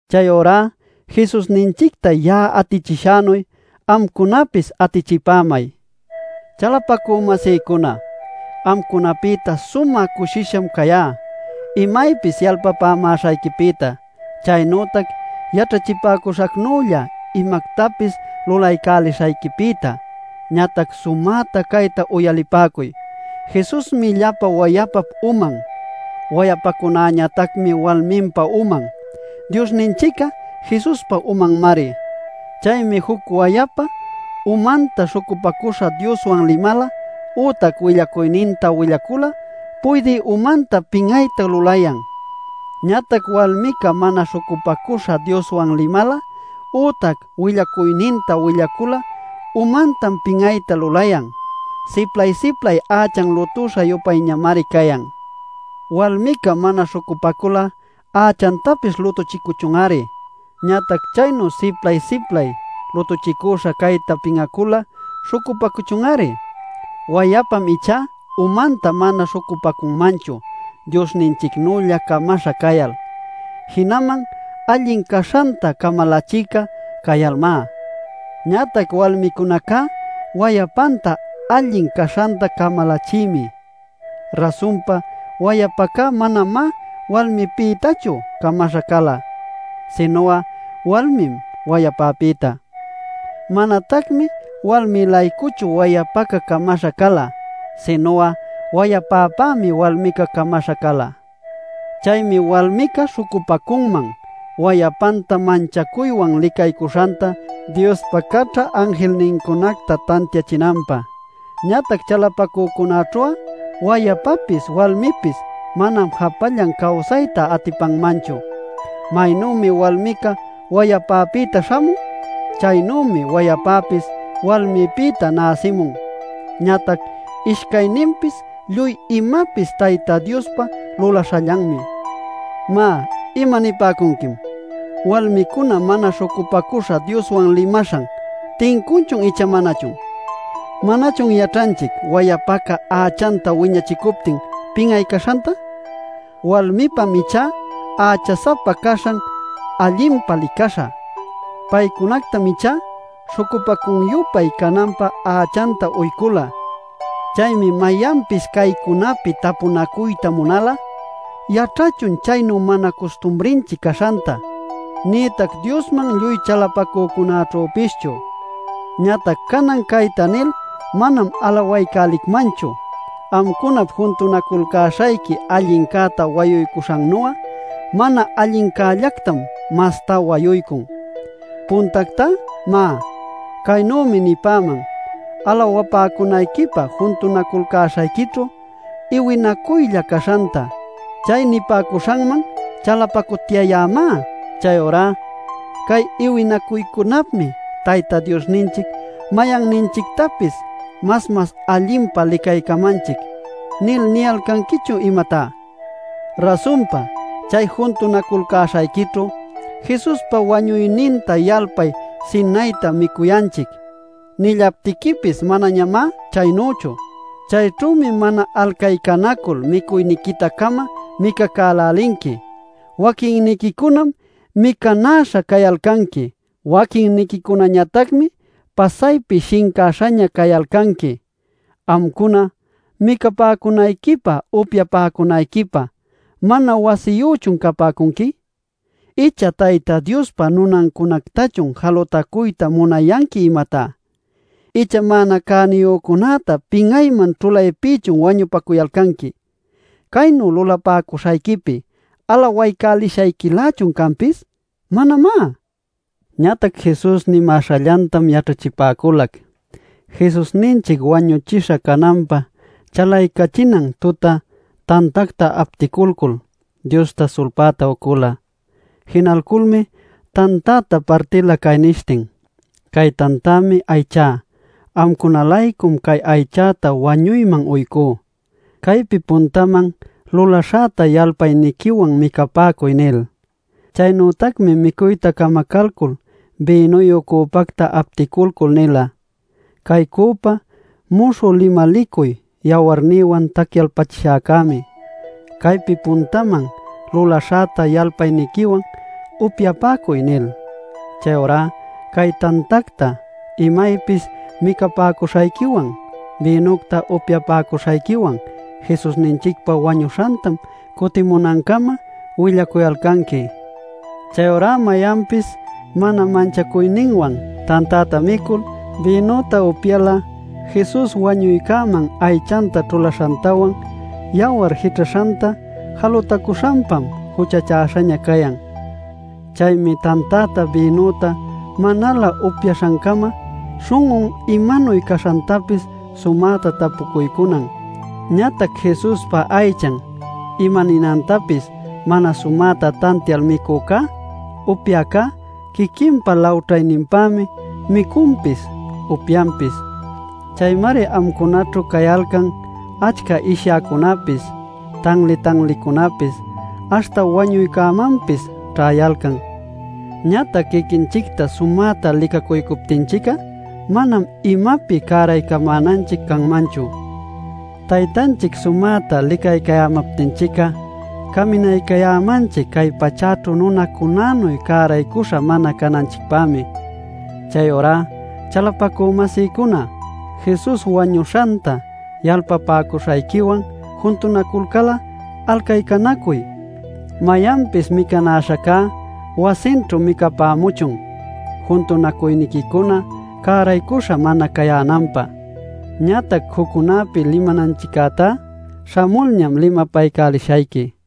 Chayurá Jesusninchicta ya'a atichishänuy, amcunapis atichipämay. Chalapacü-masïcuna, amcunapïta sumä cushisham cayá imaypis yalpapämäśhayquipïta, chaynütac yaćhachipäcuśhänülla imactapis lulaycälishayquipïta. Ñatac sumäta cayta uyalipäcuy: Jesusmi llapa wayapap uman; wayapacunäñatacmi walminpa uman. Diosninchic'a Jesuspa umanmari. Chaymi juc wayapa umanta śhucupacüśha Dioswan limal ütac willacuyninta willal'a puydï umantam pin'ayta lulayan. Ñatac walmica mana śhucupacüśha Dioswan limal ütac willacuyninta willacul'a umantam pin'ayta lulayan. Siplay-siplay ächan lutüśha-yupayñamari cayan. Walmica mana śhucupacul'a ächantapis lutuchicuchun-ari. Ñatac chaynu siplay-siplay lutuchicüśha cayta pin'acul'a śhucupacuchun-ari. Wayapam ichá umanta mana śhucupacunmanchu Diosninchicnülla camaśha cayal, jinaman allin caśhanta camalachïca cayalmá. Ñatac walmicunacá wayapanta allin caśhanta camalachïmi. Rasunpa, wayapaca manamá walmïpïtachu camaśha cala, sinu'a walmim wayapäpïta. Manatacmi walmï-laycuchu wayapaca camaśha cala. Sinu'a wayapäpämi walmica camaśha cala. Chaymi walmica śhucupacunman wayapanta manchacuywan licaycuśhanta Diospa caćha anjilnincunacta tantiachinanpä. Ñatac chalapacücunaćhu'a wayapapis walmipis manam japallan cawsayta atipanmanchu. Maynümi walmica wayapäpïta śhamun, chaynümi wayapäpis walmipïta näsimun. Ñatac ishcayninpis lluy imapis Tayta Diospa lulaśhallanmi. Má, imanipäcunquim: walmicuna mana śhucupacüśha Dioswan limaśhan ¿tincunchun icha manachun? ¿Manachun yaćhanchic wayapaca ächanta wiñachicuptin pin'ay caśhanta? Walmipam ichá ächa-sapa caśhan allinpa licaśha. Paycunactam ichá śhucupacun-yupay cananpä ächanta uycula. Chaymi mayanpis caycunapi tapunacuyta munal'a, yaćhachun chaynu mana custumrinchic caśhanta, nïtac Diosman lluy chalapacücunäćhüpischu. Ñatac canan cayta nil manam alawaycälicmanchu. Amcunap juntunaculcäśhayqui allincäta wayuycuśhannu'a mana allincällactam masta wayuycun. Puntactá má, caynümi nipäman alawapäcunayquipä juntunaculcäśhayquićhu iwinacuycunalla caśhanta. Chay nipämäśhanman chalapacutyayämá. ¿Chayurá “Cay iwinacuycunapmi Tayta Diosninchic mayanninchictapis mas mas allinpa licaycamanchic” nil niyalcanquichun imatá? Rasunpa, chay juntunaculcäśhayquićhu “Jesuspa wañuyninta yalpay sinayta micuyanchic” nillaptiquipis manañamá chaynüchu. Chayćhümi mana alcaycanacul micuyniquita-cama micacälälinqui. Waquinniquicunam micanäśha cayalcanqui; waquinniquicunañatacmi pasaypi shincäśhaña cayalcanqui. Amcuna ¿micapäcunayquipä upyapäcunayquipä mana wasiyüchun capäcunqui? ¿Icha Tayta Diospa nunancunactachun jalutacuyta munayanqui, imatá? ¿Icha mana cäniyücunäta pin'ayman ćhulaypïchun wañupacuyalcanqui? ¿Caynu lulapäcuśhayquipi alawaycälishayquilächun canpis? ¡Manamá! Ñatac Jesus nimäśhallantam yaćhachipäculac: Jesusninchic wañuchisha cananpä chalaycachinan tuta tantacta apticulcul, Diosta sulpäta ucula. Jinalculmi tantäta partila cay nishtin: “Cay tantämi aychá. Amcuna-laycum cay aychäta wañuyman uycú. Caypi puntaman lulaśhäta yalpayniquiwan micapäcuy” nil. Chaynütacmi micuyta camacalcul bïnuyu cüpacta apticulcul nila: “Cay cüpá muśhü limalicuy yawarnïwan tacyalpachishäcämi. Caypi puntaman lulaśhäta yalpayniquiwan upyapäcuy” nil. Chayurá cay tantacta imaypis micapäcuśhayquiwan bïnucta upyapäcuśhayquiwan Jesusninchicpa wañuśhantam cutimunancama willacuyalcanqui. Chayurá mayanpis mana manchacuyninwan tantäta micul, bïnüta upyal'a Jesus wañuycäman aychanta ćhulaśhantawan, yawar jićhaśhanta jalutacuśhanpam juchachäśhaña cayan. Chaymi tantäta bïnüta manalä upyaśhancama śhun'un imanuy caśhantapis sumäta tapucuycunan. Ñatac Jesuspa aychan imaninantapis mana sumäta tantial micücá upyäcá quiquinpa lawćhayninpämi micunpis upyanpis. Chaymari amcunaćhu cayalcan achca ishyäcunapis, tanli-tanlicunapis, aśhta wañuycunamanpis ćhayalcan. Ñatac quiquinchicta sumäta licacuycuptinchic'a manam imapi cäraycamänanchic canmanchu. Taytanchic sumäta licaycayämaptinchic'a caminaycayämanchic cay pachäćhu nunacunänuy cäraycuśha mana cananchicpämi. Chayurá chalapacü-masïcuna, Jesus wañuśhanta yalpapäcuśhayquiwan juntunaculcal'a alcaycanacuy. Mayanpis micanäśhacá wasinćhu micapämuchun, juntunacuyniquicuna cäraycuśha mana cayänanpä. Ñatac juccunapi limananchiccätá śhamulñam limapaycälishayqui.